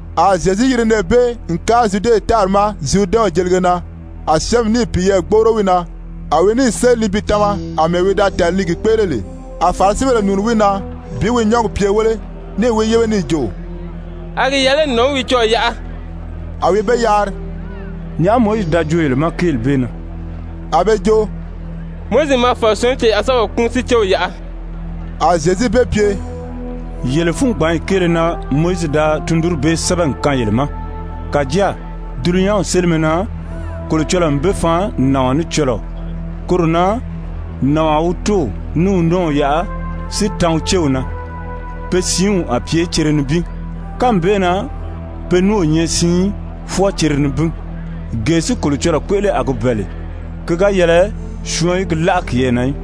A Zyezu yiri nɛɛ bee n kári Zyude tári ma, Zyuridɛnw jelige na. A syɛ́ɛnmi níì piyɛɛ gbóʔoro wi na, a wi níì séli ni bi tama àmɛɛ wi da tàli ni gi kpéʔele lè. A Farisibèle nùuni wi na bi wi nyɔ́ɔgi pye wéle, níì wi yíbe níì jo: «A gi yɛlɛ lé nàɔn í wi cɔɔ̀ yaʔa?» A wi be yari: «Nyàʔá Mowizi da joo yele ma kéeli bee na?» A be jo: «Mowizi maa fɔ̀lɔ syɔɔn í ceyaʔa-sɛ́bɛw kúun si céw yaʔa.» A Zyezu be pye: «Yele fungbanyi kéele na Mowizi da tundunri bee sɛ́bɛ n kaan yele ma. Kàjáa dulunyanw sélimɛ na ‹Kolocɔlɔɔ n be faan nàɔn ní cɔlɔɔ. Koro na nàɔn a wi tóow ní wi nɔ́ɔw yaʔa si tan wi céw na, pe siinw a pye cere nibin.› Kánmi bee na pe ní o nyɛ siin í, fwɔɔ cere nibin. Gee si Kolocɔlɔɔ kpéʔele a gi bɛ̀ɛ lè, ki ga yɛlɛ syɔɔn í gi láʔa kiyɛɛ na í.»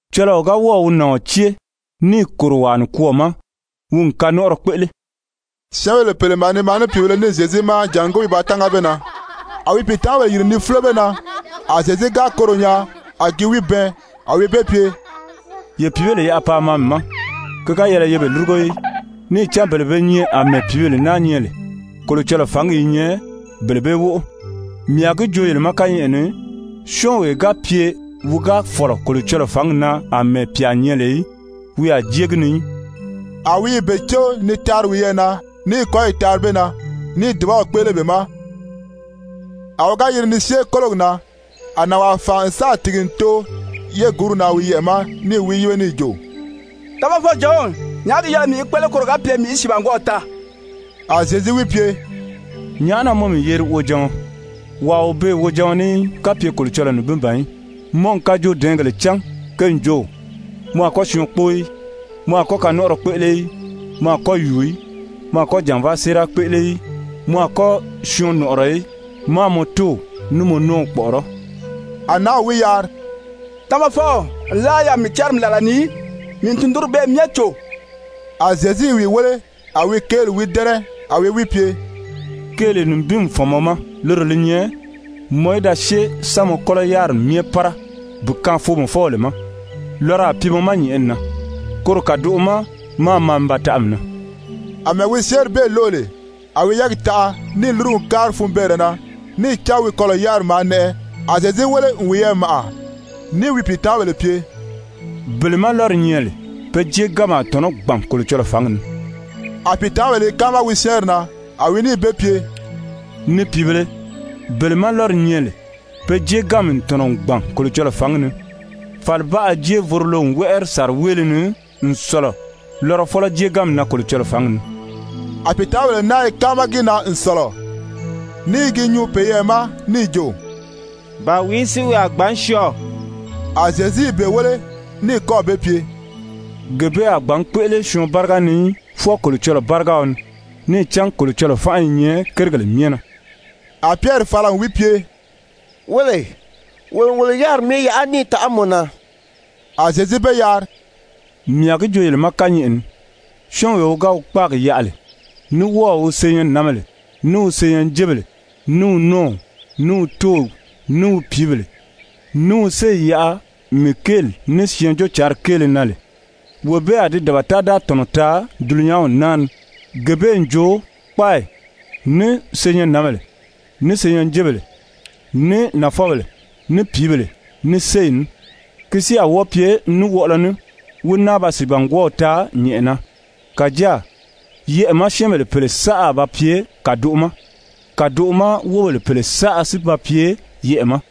Cɔlɔɔ ga wɔ́ɔ̀ wi nàɔn cée níì kòro wàa nikwɔɔ ma, wi n kanɔnʔɔrɔ kpéʔele.» Syɛ́ɛnbèle pèle maa ni maa ní pìibēle ní Zyezu ma jàngó wi ba tánga be na, a wi pìitamabèle yìri ni fúlo be na. A Zyezu ga koro nyaa, a gi wi bɛɛn, a wi be pye: «Ye pìíbèle yaʔa paa maa mii ma, ki ga yɛlɛ ye be lúrugo í. Níì cán bele be nyɛ àmɛɛ pìíbèle naa nyɛ lè, Kolocɔlɔɔ fǎngi i nyɛ bele bee wóʔo. Mii a gi joo yele ma kányɛʔɛ ni, syɔ́ɔnwee ga pye wi ga fɔ̀lɔ Kolocɔlɔɔ fǎngi na àmɛɛ pyà nyɛ lè í, wi a jée gi ni í.» A wi i be có ni taari wiyɛɛ na ní i kɔ́yi taari be na, ní i dùbaw kpéʔele be ma. A wi ga yiri ni syée kólogi na, a nànwaa fàn n sáà tìgi n too yégunri na wi yɛʔɛ̀ ma níì wi yíbe níì jo: «Tamafɔjǎnw, nyàʔá gi yɛlɛ mii í kpéʔele koro ga pye mii í sìibangwɔɔw taa?» A Zyezu wi pye: «Nyàʔá na mɔ mii yeri wojaɔn? Wàa o beè wojaɔn ní í, kapye Kolocɔlɔɔ nibin ban í. Mɔ n kajoodɛɛngèle cán, ke n jo: ‹Mɔ a kɔ́ syɔɔn kpóo í. Mɔ a kɔ́ kanɔnʔɔrɔ kpéʔele í. Mɔ a kɔ́ yùu í. Mɔ a kɔ́ jànvaa séera kpéʔele í. Mɔ a kɔ́ syɔɔn nɔ̀ʔɔrɔ í. Máā mɔ tóow ní mɔ nɔ́ɔw kpɔ̀ʔɔrɔ́.›» A nǎnw wi yari: «Tamafɔw, nlaa yaà mii cárimi làla ni, mii n tundunri bee myɛ cò.» A Zyezu i wi wéle a wi kéeli wi dɛ́nɛ a wi wí pye: «Keele nibin n fɔ̀n mɔ ma, loro li nyɛ mɔ í da syée sa mɔ kɔ́lɔ yáriri myɛ pára bi kaan foomɔfɔbèle ma, lɔrɔ a pye mɔ ma nyɛ̀ʔɛni na. Koro kàdoʔo ma, máā maa mi ba taʔa mii na.» Amɛɛ wi syɛ́ɛnri bee lóʔo lè, a wi yɛ́ɛgi tanʔa, níì lúru n kári funbɛɛnrɛ na, níì cán wi kɔlɔ̀ yáriri maa nɛʔɛ. A Zyezu wéle n wiyɛɛ màʔa, níì wi pìitamabèle pye: «Bele má lɔ́ri nyɛ lè, pe jéeganmi a tɔ̀nɔ́ gbàn Kolocɔlɔɔ fǎngi ni!» A pìitamabèle i káama wi syɛ́ɛnri na. A wi níì be pye: «Ni pìibēle, bele má lɔ́ri nyɛ lè, pe jéeganmi n tɔ̀nɔ n gbàn Kolocɔlɔɔ fǎngi ni. Fàlibaʔa jéevorolo n wɛ́ʔɛri sàriweele ni n sɔ̀lɔ lɔrɔfɔlɔ jéeganmi na Kolocɔlɔɔ fǎngi ni.» A pìitamabèle náa i káama gi na n sɔ̀lɔ ní i gi nyuu peyɛɛ ma níì jo: «Ba wìí si wi a gbǎn syɔɔ?» A Zyezu i be wéle ní kɔ́ɔ̀ be pye: «Gee bee a gbǎn kpéʔele syɔɔn báriga ni í, fwɔɔ Kolocɔlɔɔ bárigaw ni, níì cán Kolocɔlɔɔ fánʔa i nyɛ kérigèle myɛ na.» A Pyɛri fala n wi pye: «Wéle, wolo n wolo yáriri myɛ yaʔa níì taʔa mɔ na.» A Zyezu be yari: «Mii a gi joo yele ma kányɛʔɛ ni, syɔ́ɔnwee wi ga wi kpáagi yaʔa lè, ní wɔ́ɔ̀ wi senyɛnnǎnbèle, ní wi senyɛnjebèle, ní wi nɔ́ɔw, ní wi tóow, ní wi pìíbèle, ní wi séyi yaʔa mii kéeli ní Syɛɛnjóocǎnri kéele na lè, wee bee a di dabata-da tɔ̀nɔ taa dulunyanw naa ni, gee bee n jo kpáayi, ní senyɛnnǎnbèle, ní senyɛnjebèle, ní nafɔbèle, ní pìíbèle, ní séyi ní. Ki si a wɔ́ɔ pye ní wɔʔɔlɔ ní, wi náa ba sìibangwɔɔw taa nyɛ̀ʔɛna. Kàjáa yɛʔɛ̀ ma syɛ́ɛnbèle pèle saʔa a ba pye kàdoʔo ma, kàdoʔo ma wóbèle pèle saʔa si ba pye yɛʔɛ̀ ma.»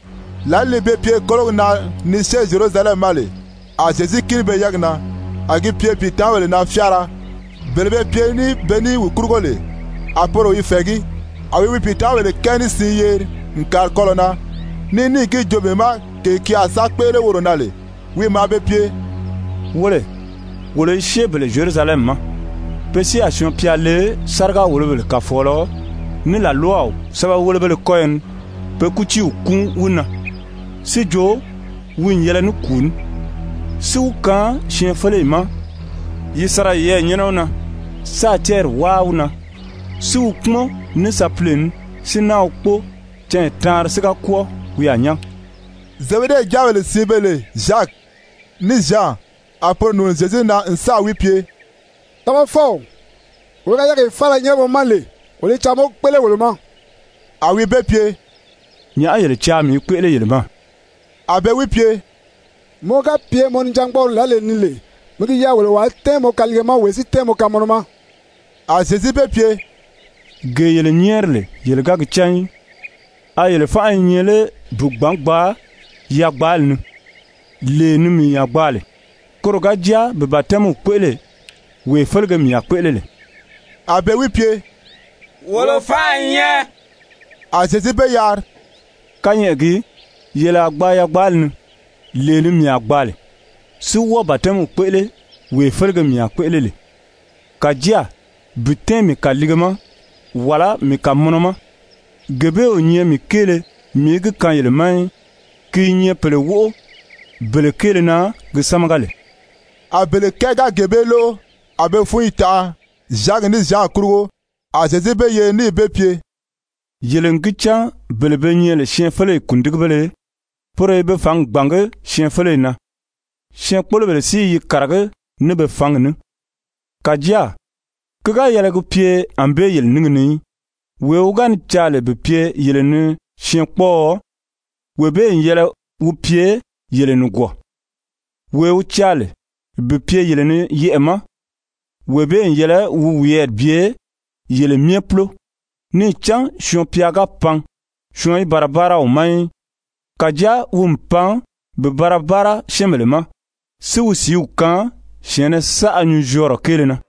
Lǎli ni be pye kólogi na ni syée Zyerusalɛmi ma lè, a Zyezu kíni be yɛ́ɛgi na. A gi pye pìitamabèle na fyáara. Bele be pye ní be ní wi kurugo lè, a poro i fɛ̀ɛgí. A wi wi pìitamabèle kɛɛ ní siin yeri n kàri kɔlɔ̀ na, ní níì gi joo be ma gee ki a sa kpéʔele woro na lè. Wi maa be pye: «Wéle, wolo i syée bele Zyerusalɛmi ma, pe si a Syɔɔn-pya le sáriga-wòlobèle kàfɔɔlɔ ní làlwaw sɛ́bɛwelebéle kɔ́yɔ ni be kútiiw kúun wi na, si jo wi n yɛlɛ ní kùu ní, si wi kaan Syɛɛnfeleyi ma, yi sa ra yiyɛɛ nyɛ́nɛ wi na, sáā tɛ́ɛri wáa wi na, si wi kpúmɔn ní sapile ní, si náa wi kpóo. Canya taanri si ga kwɔ́ɔ wi a nyán.» Zebede jáabèle siin, be lè Zyaki ní Zyan, a poro nùuni Zyezu na n sáà wi pye: «Tamafɔw, wolo ga yárigee faala nyɛ́ɛri mɔ ma lè, wolo i caa mɔ í gi kpéʔele wolo ma.» A wi be pye: «Nyàʔá yele caa mii í kpéʔele yele ma?» A be wi pye: «Mɔ ga pye mɔ nijangbɔɔri ni lǎlee ni lè, mi gi yaʔa wolo wàa í tɛ́ɛn mɔ kaliige ma, wee si tɛ́ɛn mɔ kamɔnɔ ma.» A Zyezu be pye: «Gee yele nyɛ́ɛri lè yele ga gi cán í. A yele fánʔa i nyɛ lé bi gbǎn gbaa yagbaali ni, lee ni mii a gbaa lè, koro ga jáa bi batɛmiw kpéʔele, wee félege mii a kpéʔele lè?» A be wi pye: «Wolo fánʔa i nyɛ.» A Zyezu be yari: «Kányɛʔɛ gii, yele a gbaa yagbaali ni, lee ni mii a gbaa lè, si wɔ́ɔ batɛmiw kpéʔele, wee félege mii a kpéʔele lè. Kàjáa bi tɛ́ɛn mii kàliige ma, wàlá mii kàmɔnɔ ma, gee bee o nyɛ mii kéele mii í gi kaan yele ma í, ki i nyɛ pèle wóʔo bele kéele na gi sámaga lè.» A bele kɛɛ ga gee bee lóʔo, a be fúnyi tanʔa Zyaki ní Zyan kurugo. A Zyezu be yeri níì be pye: «Yele n gi cán bele be nyɛ lè syɛɛnfeleyi kùndigibéle, poro i be fǎngi gbàngí syɛɛnfeleyi na, syɛɛnkpolobèle si i yi kàragí ní be fǎngi ní. Kàjáa ki ga yɛlɛ gi pye ànbée yele níngi ni í. Wee wi ga ni caa lè bi pye yele ni syɛɛnkpɔɔɔ, wee bee n yɛlɛ wi pye yele nìgwɔɔ. Wee wi caa lè bi pye yele ni yɛʔɛ̀ ma, wee bee n yɛlɛ wi wiyɛɛ bye yele myɛ púlo. Níì cán Syɔɔn-pya ga pan syɔɔn í ba ra báara wi ma í. Kàjáa wi n pan bi ba ra báara syɛ́ɛnbèle ma, si wi sìíw kaan syɛ̀ɛnnɛ saʔa nyunzyɔɔrɔ kéele na.»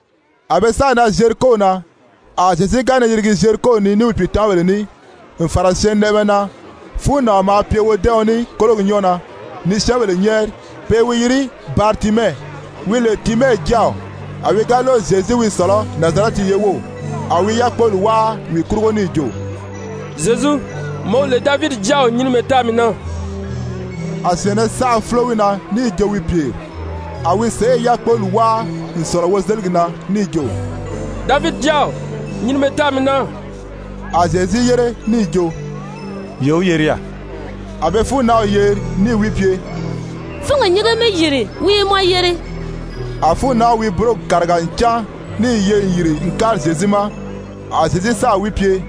A be sáà nan Zyeriko na. A Zyezu ga ni yirigi Zyeriko ni ní wi pìitamabèle ní n fàra syɛɛnnɛʔɛmɛ na, fúunnaɔn maa pye wodɛ́ɛɔn ní kólogi nyɔ́ɔ na ni syɛ́ɛnbèle nyɛ́ɛri, pe i wi yiri Baritimɛ, wi lè Timɛ jáaw. A wi ga lóʔo Zyezu wi sɔ̀lɔ́, Nazarɛti ye wów, a wi i yákpoli wáa wi kurugo níì jo: «Zyezu, mɔ wi lè Davidi Jáaw nyinimɛ taa mii na!» A syɛ̀ɛnnɛ saʔa fúlo wi na níì jo wi pyèri, a wi sèʔé i yákpoli wáa n sɔ̀lɔ wozeligi na níì jo: «Davidi Jáaw, nyinimɛ taa mii na!» A Zyezu yére níì jo: «Ye wi yeri yaà.» A be fúunnanw yeri níì wi pye: «Fúngi nyíngi mí yìri, wi i mɔ yiri.» A fúunnanw wi búrogi kàriga n cáan níì ye n yìri n kári Zyezu ma. A Zyezu sáà wi pye: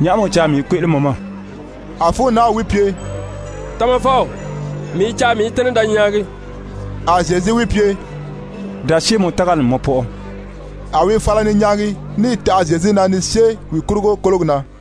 «Nyàʔá mɔ caa mii í kpéʔele mɔ ma?» A fúunnanw wi pye: «Tamafɔw, mii i caa mii í tɛ́nɛ da nyaagi.» A Zyezu wi pye: «Da syée, mɔ tágali n mɔ pɔʔɔ.» A wi fala ni nyaagi, níì taʔa Zyezu na ni syée wi kurugo kólogi na.